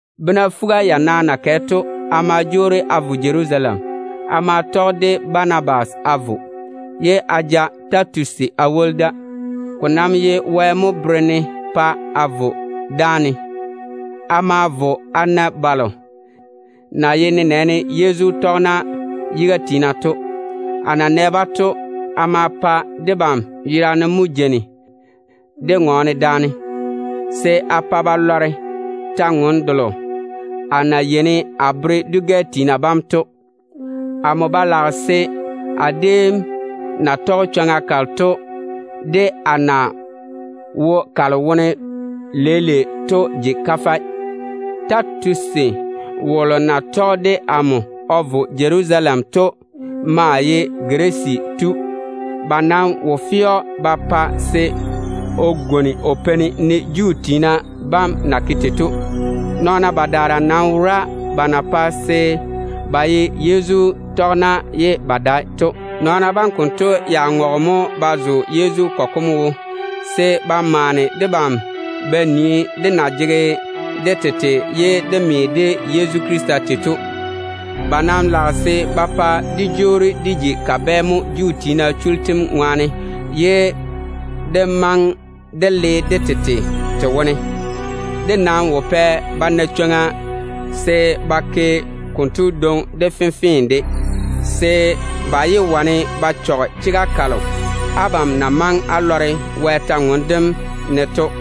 Bena fuga-yana na kɛ to, a ma jwoori a vo Jerusalem. A ma tɔge de Banabas a vo, ye a ja Titusi a woli da. Ko nam ye Wɛ mo bere-ne pa a vo dáane. A ma vo a na balo na ye nenɛɛne Yezu tɔgena yiga tiina to. A na nɛ-ba to, a ma pa debam yerane mo jeini dé ŋɔɔne daane, se a pa ba lɔre kwor-ywoŋa kalo amo na yeini a tɔɔle a bere dwi-gɛ tiina bam to. A ba lage se a déem na tɔge chwoŋa kalo to, de a na wo kalo wone leile to ji kafɛ. Titusi wolo na tɔge de amo o vo Jerusalem to maa ye Girisi tu. Ba nam wo fe‑o ba pa se o gwoni o peini, ne Juu tiina bam na ke tei to. Nɔɔna badaara nam wora ba na pae se ba ye Yezu tɔgena ye ba dae to. Nɔɔna bam konto ya ŋɔge mo ba zo Yezu kɔgɔ kom wo, se ba maane debam ba nii dé na jege dé tete ye dé me de Yezu Krista tei to. Ba nam lage se ba pa dé jwoori dé ji kabɛ mo Juu tiina chullu tem ŋwaane ye de maŋe dé le dé tete te wone. Dé nam wo pɛ ba na chwoŋa se ba ke konto dwoŋi de fenfee de, se ba yé wane ba chɔge chega kalo abam na maŋe á tɔge Wɛ kwor-ywoŋa kam ŋwaane á sɛ to.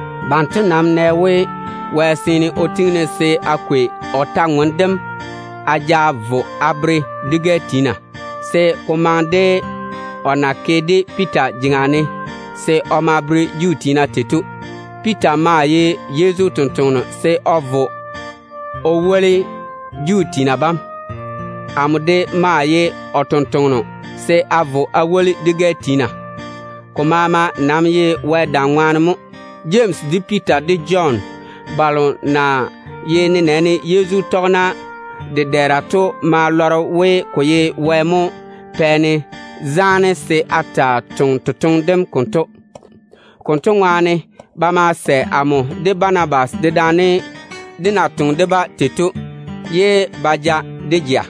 Banto nam nɛ we, Wɛ seene o tiŋi-ne se a kwei o kwor-ywoŋa kam a ja vo a bere dwi-gɛ tiina, se ko maŋe de o na ke-ka Piita jeŋa ne se o ma bere Juu tiina tei to. Piita maa ye Yezu totoŋa nakwe se o vo o woli Juu tiina bam. Amo de maa ye o tontoŋeno se a vo a woli dwi-gɛ tiina. Ko maama nam ye Wɛ dam ŋwaane mo. Jemsi, de Piita, de Jɔn balo na ye nenɛɛne Yezu tɔgena dedɛɛra to ma lɔre we, ko ye Wɛ mo pɛ-ne zaane se a taa toŋe totoŋe dem konto. Konto ŋwaane ba ma sɛ amo de Banabas dedaane dé na toŋe de-ba tei to, ye ba ja dé jea.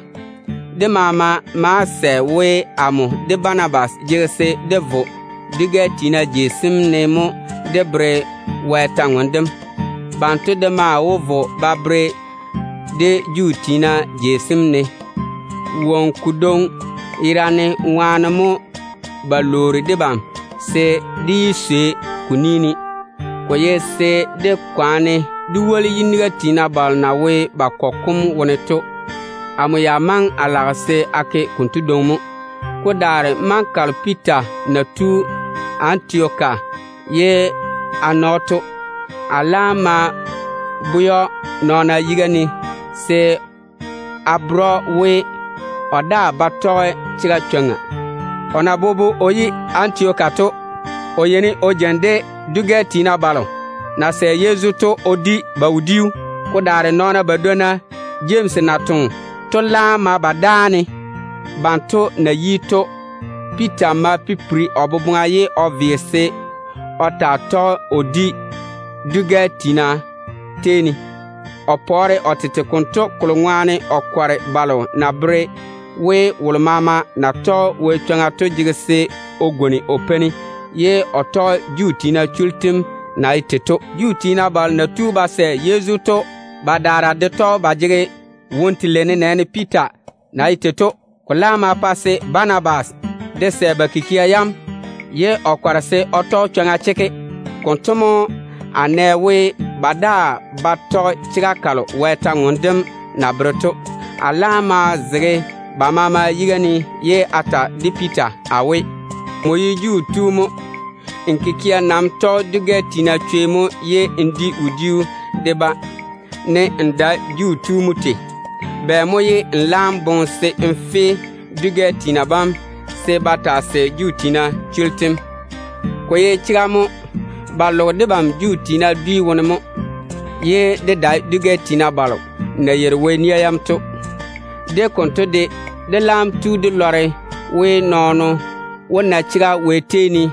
Debam maama ma sɛ we, amo de Banabas jege se dé vo dwi-gɛ tiina jei sem ne mo dé bere-ba Wɛ kwor-ywoŋa kam. Banto de maa wó vo ba tɔɔle-ka Juu tiina jei sem ne. Woŋo kodwoŋi yerane ŋwaane mo ba lwoori debam se dé yé swei ko ni ne. Ko ye se dé kwaane dé woli yiniga tiina balo na wo ba kɔgɔ kom wone to. Amo ya maŋe a lage se a ke konto dwoŋi mo. Ko daare maŋa kalo Piita na tu Antioka ye a na‑o to, a laam ma bwɛ‑o nɔɔna yiga ne se a bere‑o we, o daa ba tɔge chega chwoŋa. O na bobo o yi Antioka to, o yeini o jeini de dwi-gɛ tiina balo na sɛ Yezu to o di ba wodiu. Ko daare nɔɔna badwonna Jemsi na toŋe to laam ma ba dáane. Banto na yi to, Piita ma pipiri o boboŋa ye o ve se o taa tɔge o di wodiu dwi-gɛ tiina tei ne. O pɔɔre o tete konto, kolo ŋwaane o kɔre balo na bere we, wolo maama na tɔge Wɛ chwoŋa to jege se o gwoni o peini, ye o tɔge Juu tiina chullu tem na ye tei to. Juu tiina balo na tu ba sɛ Yezu to badaara de tɔge ba jege ni-zɛ ni-zɛ, nenɛɛne Piita na ye tei to. Ko laam ma pa se Banabas de sɛ ba kikia yam, ye o kɔre se o tɔge chwoŋa chekke. Konto mo a nɛ we, ba daa ba tɔge chega kalo Wɛ kwor-ywoŋa kam na bere to. A laam ma zege ba maama yiga ne ye a ta de Piita a we, “Nmo ye Juu tu mo. N kikia nam tɔge dwi-gɛ tiina chwei mo, ne n dae Juu tu mo tei. Bɛ mo ye n laam boŋe se n fe dwi-gɛ tiina bam se ba taa sɛ Juu tiina chullu tem?” Ko ye chega mo, ba loge debam Juu tiina dwi wone mo, ye dé dae dwi-gɛ tiina balo na yeiri Wɛ nia yam to. De konto de, dé laam tu dé lɔre we, nɔɔno wó na chega Wɛ tei ne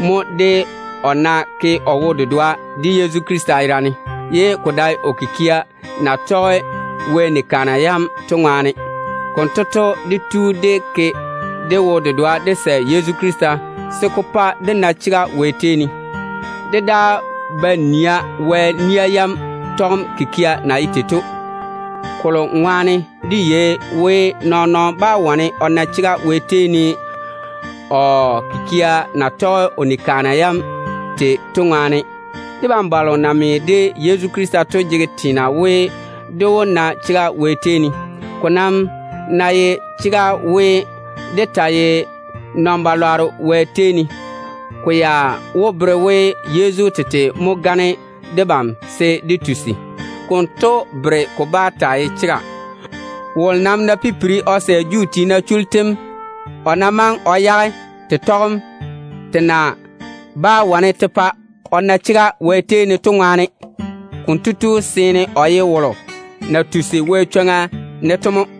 mo de o na ke o wo-dedoa de Yezu Krista to, se ko dae o kikia na tɔge Wɛ ni-kaana yam to ŋwaane. Konto to, dé tu dé ke dé wo-dedoa dé sɛ Yezu Krista, se ko pa dé na chega Wɛ tei ne. Dé daa ba nia Wɛ nia yam tɔgem kikia na ye tei to, kolo ŋwaane dé yei we, nɔɔn-nɔɔno bá wane o na chega Wɛ tei ne o kikia na tɔge o ni-kaana yam tei to ŋwaane. Debam balo na me de Yezu Krista to jege teena we, dé wó na chega Wɛ tei ne. Debam nam ná tu dé ji nɔn-chechɔgero Wɛ ni-kaana yam seeni, konto wó bere we Yezu tete mo gane debam se dé tusi mo na? Konto bere ko bá taa ye chega. Wolo nam ná pipiri o jwoori o sɛ Juu tiina chullu tem, o na maŋe o yage te tɔgem te na bá wane te pa o na chega Wɛ tei ne to ŋwaane, konto tu seene o ye wolo na tusi Wɛ chwoŋa ne to mo.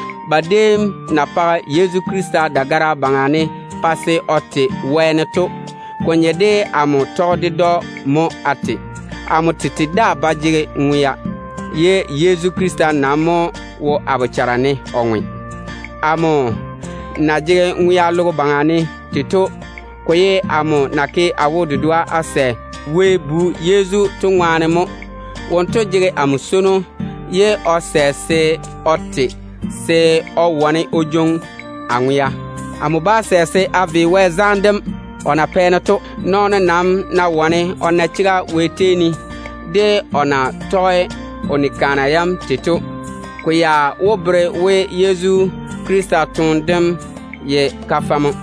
Ba déem na page Yezu Krista dagara yuu ne pa se o te wɛɛne to, ko nye de amo tɔge ded‑o mo a te. Amo tete daa ba jege ŋwea, ye Yezu Krista nam mo wo a bochare ne o ŋwe. Amo na jege ŋwea logo baŋa ne tei to, ko ye amo na ke a wo-dedoa a sɛ Wɛ Bu Yezu to ŋwaane mo. Wonto jege amo swono, ye o sɛ se o te se o wane o jwoŋi a ŋwea o yage. Amo bá sɛ se a ve Wɛ zaane dem o na pɛ-ne to. Nɔɔno nam ná wane o na chega Wɛ tei ne de o na tɔge o ni-kaana yam tei to, ko ya wó bere we Yezu Krista toone dem ye kafɛ mo.